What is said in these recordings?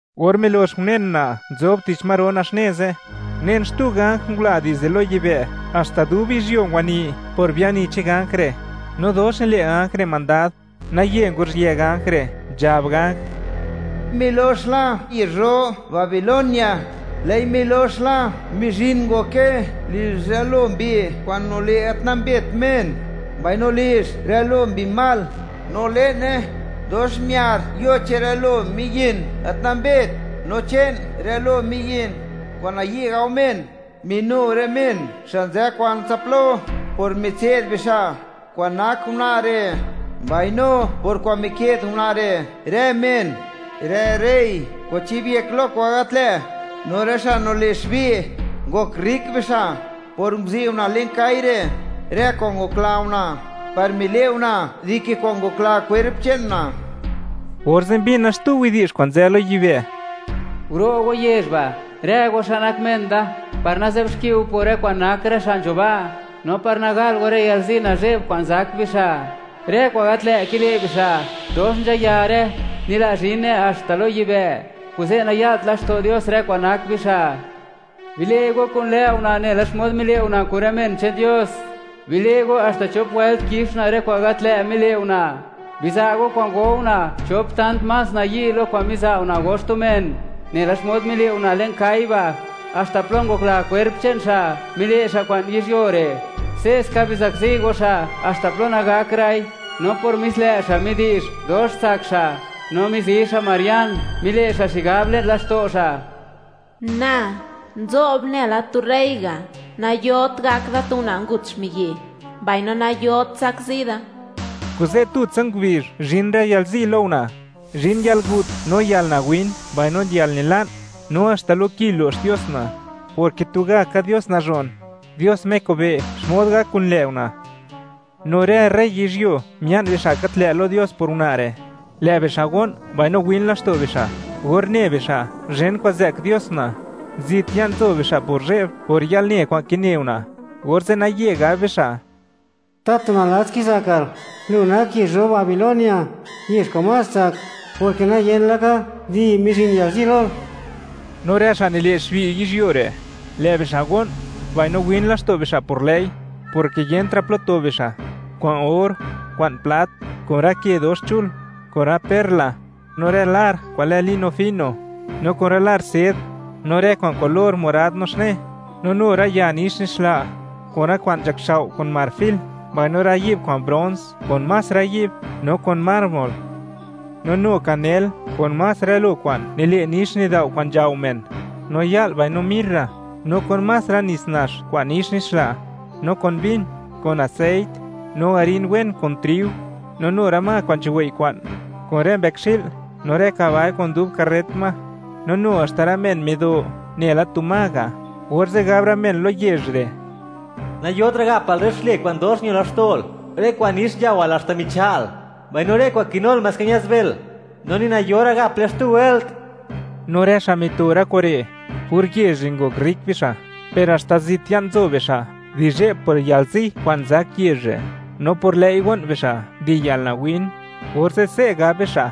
Or milox unen una' nzob tich ma ro naxne ze', unen xtu ganj ngula dizde lo yibë', haxta dub yizhyuo ngwani por biani che'n ganj re', no dox nile' ganj re' mandad. Naye nguruzhië ganj re', nzhab ganj: ¡Milox la yezh ro Babilonia, lë'i milox la! Mizhin ngoke lizh rë lo mbi kwa'n nile' gat nambet men. Mbaino lizh rë lo mbi mal; no le'ne, dox miar yo che'n rë lo miyin gat nambet, no che'n rë lo miyin kwa'n nayi' gao men. Minu rë men xa' nzë kwansa plo, por mitse'd bixa' kwa'n nak una' re', mbaino por kwa'n mike'd una' re' rë men, rë rey ngwachibyek lo kwa'n gat lë', no rë xa' nile' xbi'. Ngok rrik bixa' por nguzi' una' le'n kai (kwa' gal) re' rë kwa'n ngokla una', par mile' una' dike kwa'n ngokla kwerp che'n una'. Orze' mbina xtu widi'zh kwa'n nzë lo yibë': Guro' go yezh ba', rë go xa' nak men da, par nazë'bxki go por rë kwa'n nak rë xa' nzho ba', no par nagal go, rë yalzi nazhe'b kwa'n zak bixa'. Rë kwa'n gat lë' kile' bixa' dox nzhayare, nila' zhine haxta lo yibë', kuze', naya'lt laxto' Dios rë kwa'n nak bixa'. Bile' go kun lë' una' nela xmod mile' una' kun rë men che'n Dios. Bile' go haxta chop wëlt kix una' rë kwa'n gat lë' mile' una'. Biza' go kwa'n go una', chop tant más nayi' lo kwa'n miza' una', go xtu men. Nela xmod mile' una' le'n kai (kwa' gal) ba' haxta plo ngokla kwerp che'n xa', mile' xa' kwa'n yizhyuo re'. Se'ska bizakzi go xa' haxta plo nagakra'i. No por mis lë' xa', midi'zh dox tsak xa', no mizi xa' marian. Mile' xa' xigab, le'n laxto' xa': “Na, nzo'b nela tu rey ga', nayot gak da tu una' ngut xmiyi', mbaino nayot zakzi da.” Kuze', tutsa ngubizh zhin rë yalzi lo una': zhin yalgut, no yalnawin, mbaino yalnila'n. No haxta lo ki lo'x Dios una', porke tugaka Dios nazhon, Dios Me kobe' (wi') xmod gak kun lë' una'. No rë rey yizhyuo mia'n bixa' gat lë' lo Dios por una' re', lë' bixa' go'n, mbaino win laxto' bixa' or ne bixa', zhen kwa'n zë'k Dios una'. Zit ya'n nzo bixa' por zhe'b, por yalne kwa'n kine una', orze' naye gab bixa': ¡Tatu nalats kizakal!, lu nak yezh ro Babilonia, yezh kwa'n más tsak; porke nayen laka, ¡di!, mizhin yalzi lol. No rë xa' nile' xbi' yizhyuo re', lë' bixa' go'n, mbaino win laxto' bixa' por lë'i, porke yentra' plo to bixa': kwa'n or, kwa'n plat, kun rë ke dox chul, kun rë perla, no rë lar kwa'n lë lino fino, no kun rë lar sed, no rë kwa'n kulor morad naxne, no nu rë ya nix nixla, kun rë kwa'n nzhakxao' kun marfil, mbaino rë yi'b kwa'n brons, kun más rë yi'b, no kun mármol; no nu kanel kun más rë lo kwa'n nile' nix nidao' kwa'n nzhao men; no ya'l mbaino mirra, no kun más rë nits nax kwa'n nix nixla; no kun vin, kun aseit, no harin wen kun triu; no nu rë ma kwa'n nzhuwei' kwa'n, kun rë mbëkxi'l no rë kabai kun dub karret ma; no nu haxta rë men mido nela tu ma ga'. Orze' gab rë men lo yezh re': ¡Nayotra' gapal rë xlë kwa'n dox ño laxto'l, rë kwa'n nix nzhaowal, haxta micha'l. Mbaino rë kwa'n kinul, maska ña'zbël; no ni nayora' gaple xtu wëlt! No rë xa' mito rë kure', por yezh re' ngok rrik bixa'; per haxta zit ya'n nzo bixa' di zhe'b por yalzi kwa'n zak yezh re', no por lë'i go'n bixa' di yalnawin, orze' se' gab bixa':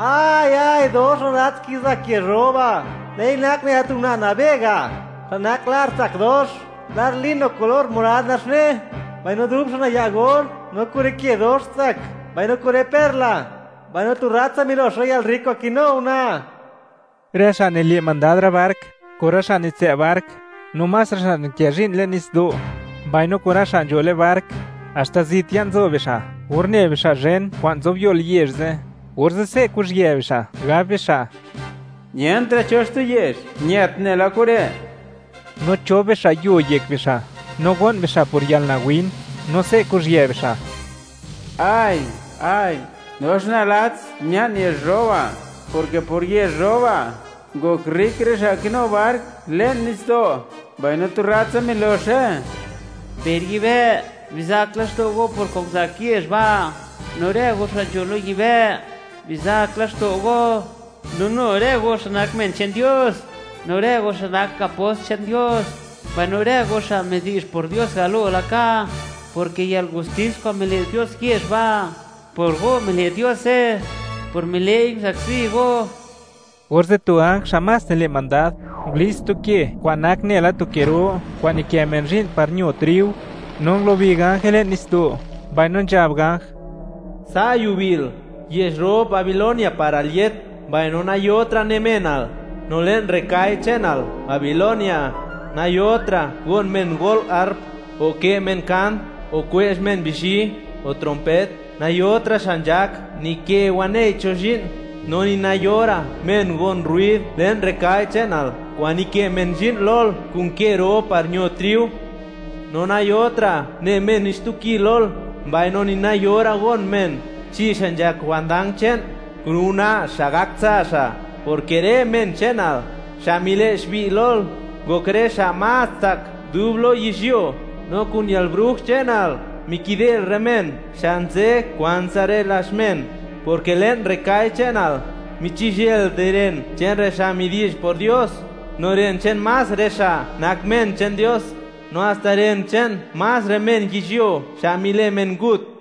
¡Ay, ay; dox nalats kizak yezh ro ba'! Lë'i nak nela tu una' nabe ga', xa' nak lar tsak dox, lar lino kulor morad naxne, mbaino dub xa' naya' or no kun rë ke dox tsak, mbaino kun rë perla. ¡Mbaino tu rratsa milox rë yalrrik kwa'n kinu una'! Rë xa' nile' mandad rë bark, kun rë xa' nitsë' bark, no más rë xa' nikë zhi'n le'n nitsdo', mbaino kun rë xa' nzho le'n bark; haxta zit ya'n nzo bixa'; or ne bixa' zhen kwa'n zobyol yezh ze', orze' se' kuzhië bixa', gab bixa': “Yentra' cho xtu yezh ñët nela kure'.” No chob bixa' yuo yek bixa', no go'n bixa' por yalnawin, no se' kuzhië bixa': ¡Ay, ay! ¡Dox nalats mia'n yezh ro ba'!, porke por yezh ro ba', ngok rrik rë xa' kinu bark le'n nitsdo', mbaino, ¡tu rratsa miloxe! Per yibë', bizak laxto' go por kwa'n nguzak yezh ba'; no rë go xa' nzho lo yibë', bizak laxto' go. No nu rë go xa' nak men che'n Dios, no rë go xa' nak apost che'n Dios, mbaino rë go xa' midi'zh por Dios galo laka, porke yalgustis kwa'n mile' Dios yezh ba'; por go mile' Diose, por mile'i nguzakzi go. Orze' tu ganj xa' más nile' mandad, ngulits tu ke kwa'n nak nela tu ke ro kwa'n nikë men zhi'n par ño triu, no ngulubi ganje le'n nitsdo'. Mbaino nzhab ganj: Sa' yubil, yezh ro Babilonia par al yët, mbaino nayotra' ne menal. No le'n rë kai che'nal, Babilonia, nayotra' gon men go'l harp, o kë' men kant, o kwe'zh men bizhi, o trompet. Nayotra' xa' nzhak nikë wanei cho zhi'n, no ni nayora' men gon rruid le'n rë kai che'nal kwa'n nikë men zhi'n lol kun ke ro par ño triu. No nayotra' ne men ni xtu ki lol, mbaino ni nayora' gon men, chi xa' nzhak jwandang che'n, kun una' xa' gak tsa' xa', porke rë men che'nal xa' mile' xbi' lol, ngok rë xa' más tsak dub lo yizhyuo. No kun yalbruj che'nal, mikidel rë men, xa' nzë kwantsa rë lazh men, porke le'n rë kai che'nal, michizhël di ren che'n rë xa' midi'zh por Dios, no ren che'n más rë xa' nak men che'n Dios, no haxta ren che'n más rë men yizhyuo xa' mile' men ngut.